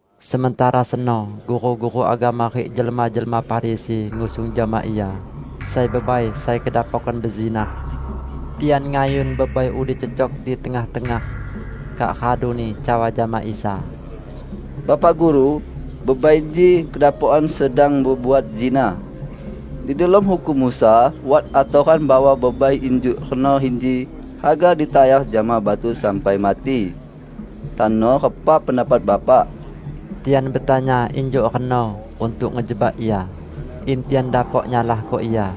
Sementara seno, guru-guru agama rik jelma-jelma Farisi ngusung jama Ia sai bebai sai kedapokan bezinah. Tian ngayun bebai udi cecok di tengah-tengah, kak raduni cawa jama Isa, "Bapak Guru, bebai inji kedapokan sedang bebuat zinah. Di delom Hukum Musa wat atoran bahwa bebai injuk reno inji haga ditayar jama batu sampai mati. Tano repa pendapat Bapak?" Tian betanya injuk reno untuk ngejebak Ia, in tian dapok nyalahko Ia.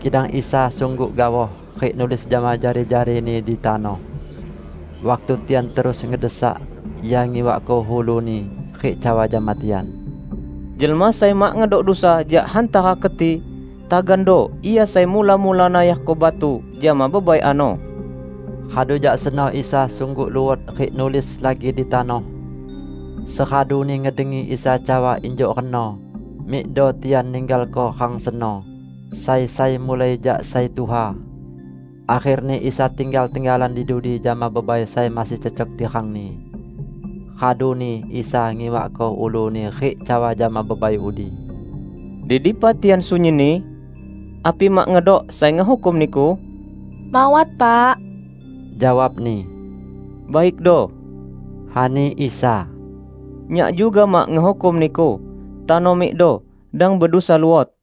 Kidang Isa sungguk gaoh, rik nulis jama jari-jari-Ni di tanoh. Waktu tian terus ngedesak, Ia ngiwakko ulu-Ni rik cawa jama tian, "Jelma sai mak ngedok dusa jak hantara keti, tagando ia sai mula-mula nayarko batu jama bebai ano." Radu jak seno Isa sungguk luot rik nulis lagi di tanoh. Seraduni ngedengi Isa cawa injuk reno, mikdo tian ninggalko rang seno, sai-sai mulai jak sai tuha. Akherni Isa tinggal tenggalan di dudi jama bebai sai masih cecok di rangni. Raduni Isa ngiwakko ulu-Ni rik cawa jama bebai udi, "Di dipa tian sunyinni? Api mak ngedok sai ngehukum niku?" "Mawat, Pak," jawabni. "Baikdo," ani Isa, "Nyak juga mak ngehukum niku. Tano mikdo, dang bedusa luot."]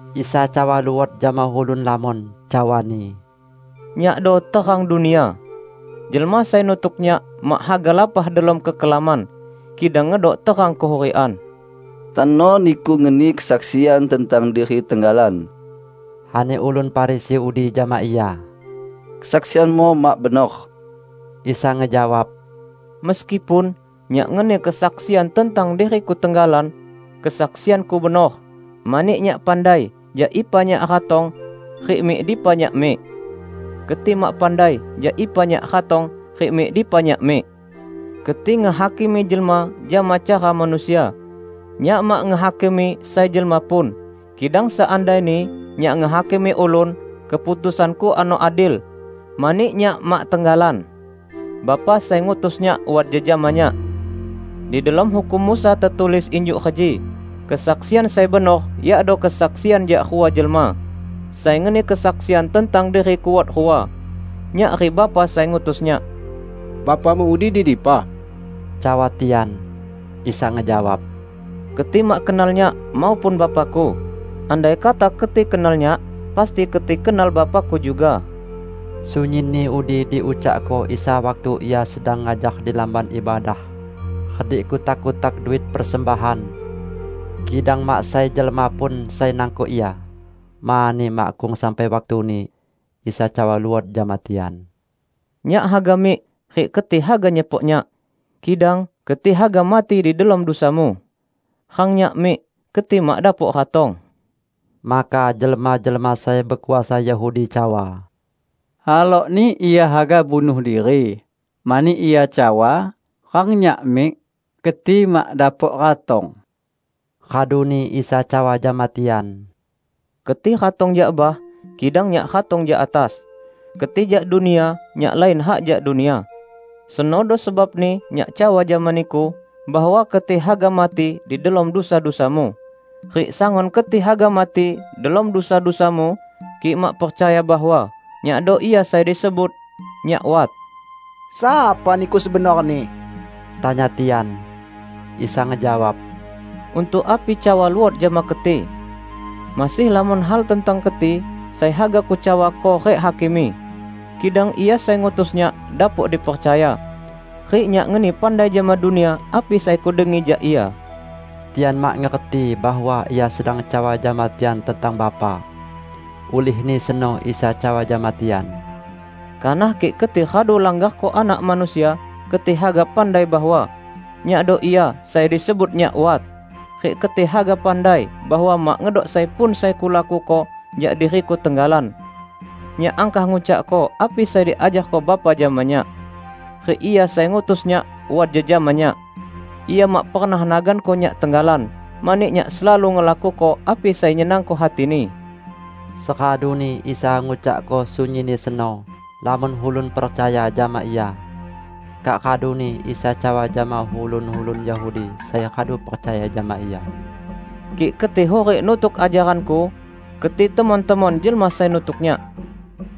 Isa cawa luot jama ulun lamon, cawa-Ni, "Nyakdo terang dunia. Jelma sai nutuk Nyak mak haga lapah delom kekelaman, kidang ngedok terang kehurikan." "Tano Niku ngeni kesaksian tentang diri tenggalan," ani ulun Farisi udi jama Ia, "kesaksian-Mu mak benor." Isa ngejawab, "Meskipun Nyak ngeni kesaksian tentang diri-Ku tenggalan, kesaksian-Ku benor; mani Nyak pandai jak ipa Nyak ratong rik mik dipa Nyak mik. Keti mak pandai jak ipa Nyak ratong rik mik dipa Nyak mik. Keti ngehakimi jelma jama cara manusia; Nyak mak ngehakimi sai jelma pun. Kidang seandaini Nyak ngehakimi ulun, keputusan-Ku ano adil, mani Nyak mak tenggalan; Bapa sai ngutus Nyak wat jejama Nyak. Di delom Hukum Musa tetulis injuk reji: Kesaksian sai benor yakdo kesaksian jak rua jelma. Sai ngeni kesaksian tentang diri-Ku wat rua -- Nyak rik Bapa sai ngutus Nyak." "Bapa-Mu udi di dipa?" cawa tian. Isa ngejawab, "Keti mak kenal Nyak maupun Bapa-Ku. Andaikata keti kenal Nyak, pasti keti kenal Bapa-Ku juga." Sunyinni udi diucakko Isa waktu Ia sedang ngajar di Lamban Ibadah redik kutak-kutak duit persembahan. Kidang mak sai jelma pun sai nangkok Ia, mani makkung sampai waktuni. Isa cawa luot jama tian, "Nyak haga mik, rik keti haga nyepok Nyak, kidang keti haga mati di delom dusamu. Rang Nyak mik, keti mak dapok ratong." Maka jelma-jelma sai bekuasa Yahudi cawa, "Halokni Ia haga bunuh diri, mani Ia cawa, 'Rang Nyak mik, keti mak dapok ratong.' " Raduni Isa cawa jama tian, "Keti ratong jak bah; kidang Nyak ratong jak atas. Keti jak dunia; Nyak lain hak jak dunia. Senodo sebabni Nyak cawa jama niku, bahwa keti haga mati di delom dusa-dusamu. Rik sangun keti haga mati delom dusa-dusamu, kik mak percaya bahwa 'Nyakdo Ia sai disebut NYAK WAT'." "Sapa Niku sebenorni?" tanya tian. Isa ngejawab, "Untuk api cawa luot jama keti! Masih lamon hal tentang keti sai haga Kucawako rik hakimi. Kidang Ia sai ngutus Nyak dapok dipercaya. Rik Nyak ngeni pandai jama dunia api sai Kudengi jak Ia." Tian mak ngerti bahwa Ia sedang cawa jama tian tentang Bapa. Ulihni seno Isa cawa jama tian, "Kanah kik keti radu langgarko Anak Manusia, keti haga pandai bahwa, 'Nyakdo Ia sai disebut NYAK WAT', rik keti haga pandai bahwa mak ngedok sai pun sai Kulakuko jak diri-Ku tenggalan. Nyak angkah ngucakko api sai diajarko Bapa jama Nyak. Rik Ia sai ngutus Nyak wat jejama Nyak. Ia mak pernah naganko Nyak tenggalan, mani Nyak selalu ngelakuko api sai nyenangko hati-Ni." Seraduni Isa ngucakko sunyinni seno, lamon ulun percaya jama Ia. Kak raduni Isa cawa jama ulun-ulun Yahudi sai radu percaya jama Ia, "Kik keti hurik nutuk ajaran-Ku keti temon-temon jelma sai nutuk Nyak,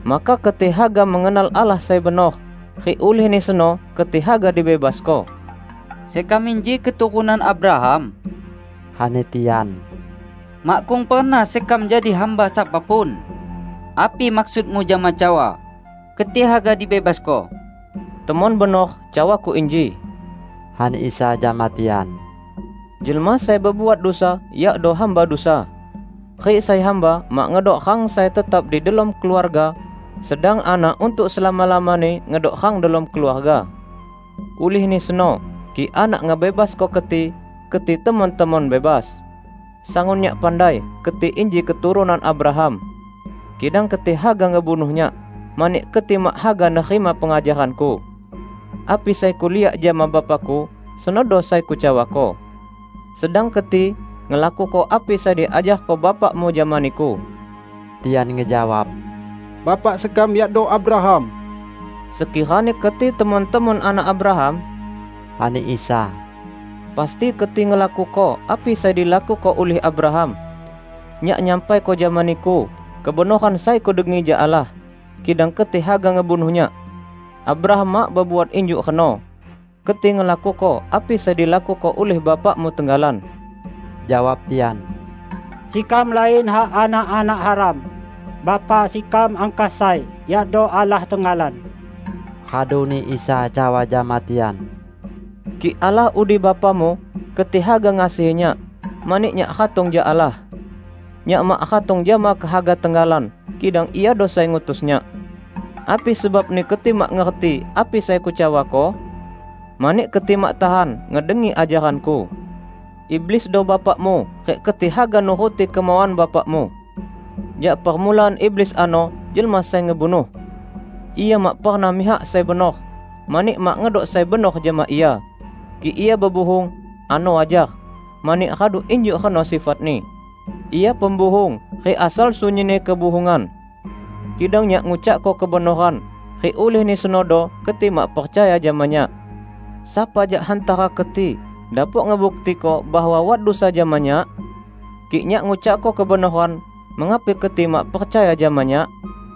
maka keti haga mengenal Allah sai benor, rik ulihni seno keti haga dibebasko." "Sekam inji keturunan Abraham," ani tian. "Makkung pernah sekam jadi hamba sapa pun! Api maksud-Mu jama cawa, 'Keti haga dibebasko'?" "Temon benor cawa-Ku inji," ani Isa jama tian. "Jelma sai bebuat dusa, yakdo hamba dusa. Rik sai hamba mak ngedok rang sai tetap di delom keluarga, sedang anak untuk selama-lamani ngedok rang delom keluarga. Ulihni seno, kik Anak ngebebasko keti, keti temon-temon bebas. Sangun Nyak pandai keti inji keturunan Abraham. Kidang keti haga ngebunuh Nyak, mani keti mak haga nerima pengajaran-Ku. Api sai Kuliak jama Bapa-Ku, senodo sai Kucawako. Sedang keti ngelakuko api sai diajarko bapakmu jama niku." Tian ngejawab, "Bapak sekam yakdo Abraham." "Sekirani keti temon-temon anak Abraham," ani Isa, "pasti keti ngelakuko api sai dilakuko ulih Abraham. Nyak nyampaiko jama niku kebenoran sai Kudengi jak Allah, kidang keti haga ngebunuh Nyak. Abraham mak bebuat injuk reno! Keti ngelakuko api sai dilakuko ulih bapakmu tenggalan." Jawab tian, "Sekam lain hak anak-anak haram. Bapa sekam angkah sai, yakdo Allah tenggalan." Raduni Isa cawa jama tian, "Kik Allah udi Bapamu, keti haga ngasihi Nyak, mani Nyak ratong jak Allah. Nyak mak ratong jama kehaga tenggalan, kidang Iado sai ngutus Nyak. Api sebabni keti mak ngerti api sai Kucawako? Mani keti mak tahan ngedengi ajaran-Ku. Iblisdo bapakmu rik keti haga nuruti kemauan bapakmu. Jak permulaan iblis ano jelma sai ngebunuh. Ia mak pernah mihak sai benor, mani mak ngedok sai benor jama ia. Kik ia bebuhung, ano wajar, mani radu injuk reno sifatni. Ia pembuhung rik asal sunyinni kebuhungan. Kidang Nyak ngucakko kebenoran, rik ulihni senodo keti mak percaya jama Nyak. Sapa jak hantara keti dapok ngebuktiko bahwa wat dusa jama Nyak? Kik Nyak ngucakko kebenoran, mengapi keti mak percaya jama Nyak?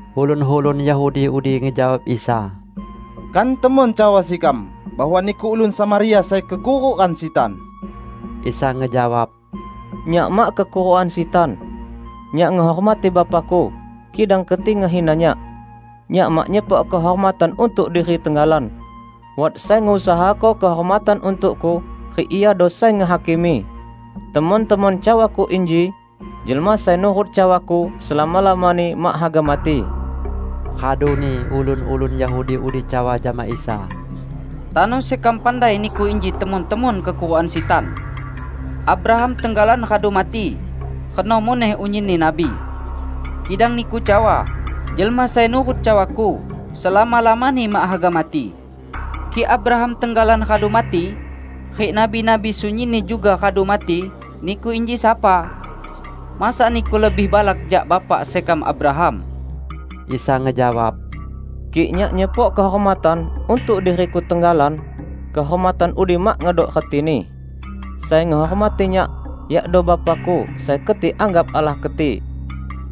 Ulun-ulun Yahudi udi ngejawab Isa, "Kan temon cawa sekam bahwa Niku ulun Samaria sai kekurukan sitan?" Isa ngejawab, "Nyak mak kekurukan sitan. Nyak ngehormati Bapa-Ku, kidang keti ngehina Nyak. Nyak mak nyepok kehormatan untuk diri tenggalan. Wat sai ngusahako kehormatan untuk-Ku, rik Iado sai ngehakimi. Temon-temon cawa-Ku inji, jelma sai nurut cawa-Ku selama-lamani mak haga mati." Raduni ulun-ulun Yahudi udi cawa jama Isa, "Tano sekam pandai Niku inji temon-temon kekurukan sitan! Abraham tenggalan radu mati, reno muneh unyinni nabi. Kidang Niku cawa, 'Jelma sai nurut cawa-Ku, selama-lamani mak haga mati.' Kik Abraham tenggalan radu mati, rik nabi-nabi sunyinni juga radu mati, Niku inji sapa? Masa Niku lebih balak jak bapak sekam Abraham!" Isa ngejawab, "Kik Nyak nyepok kehormatan untuk diri-Ku tenggalan, kehormatan udi mak ngedok retini. Sai ngehormati Nyak yakdo Bapa-Ku sai keti anggap Allah keti,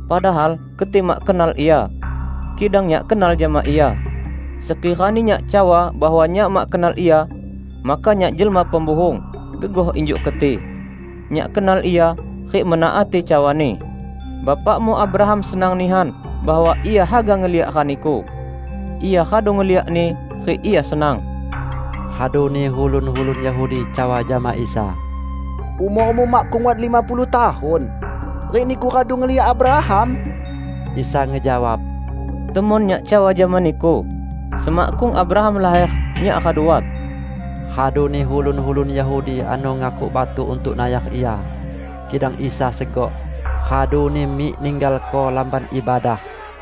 padahal keti mak kenal Ia. Kidang Nyak kenal jama Ia. Sekirani Nyak cawa bahwa Nyak mak kenal Ia, maka Nyak jelma pembuhung, gegoh injuk keti. Nyak kenal Ia, rik menaati cawa-Ni. Bapakmu Abraham senang nihan bahwa ia haga ngeliak rani-Ku. Ia radu ngeliakni rik ia senang!" Raduni ulun-ulun Yahudi cawa jama Isa, "Umor-Mu makkung wat lima puluh tahun, rik Niku radu ngeliak Abraham?" Isa ngejawab, "Temon Nyak cawa jama niku: semakkung Abraham laher, Nyak radu wat." Raduni ulun-ulun Yahudi ano ngakuk batu untuk nayar Ia; kidang Isa segok, raduni mik ninggalko Lamban Ibadah.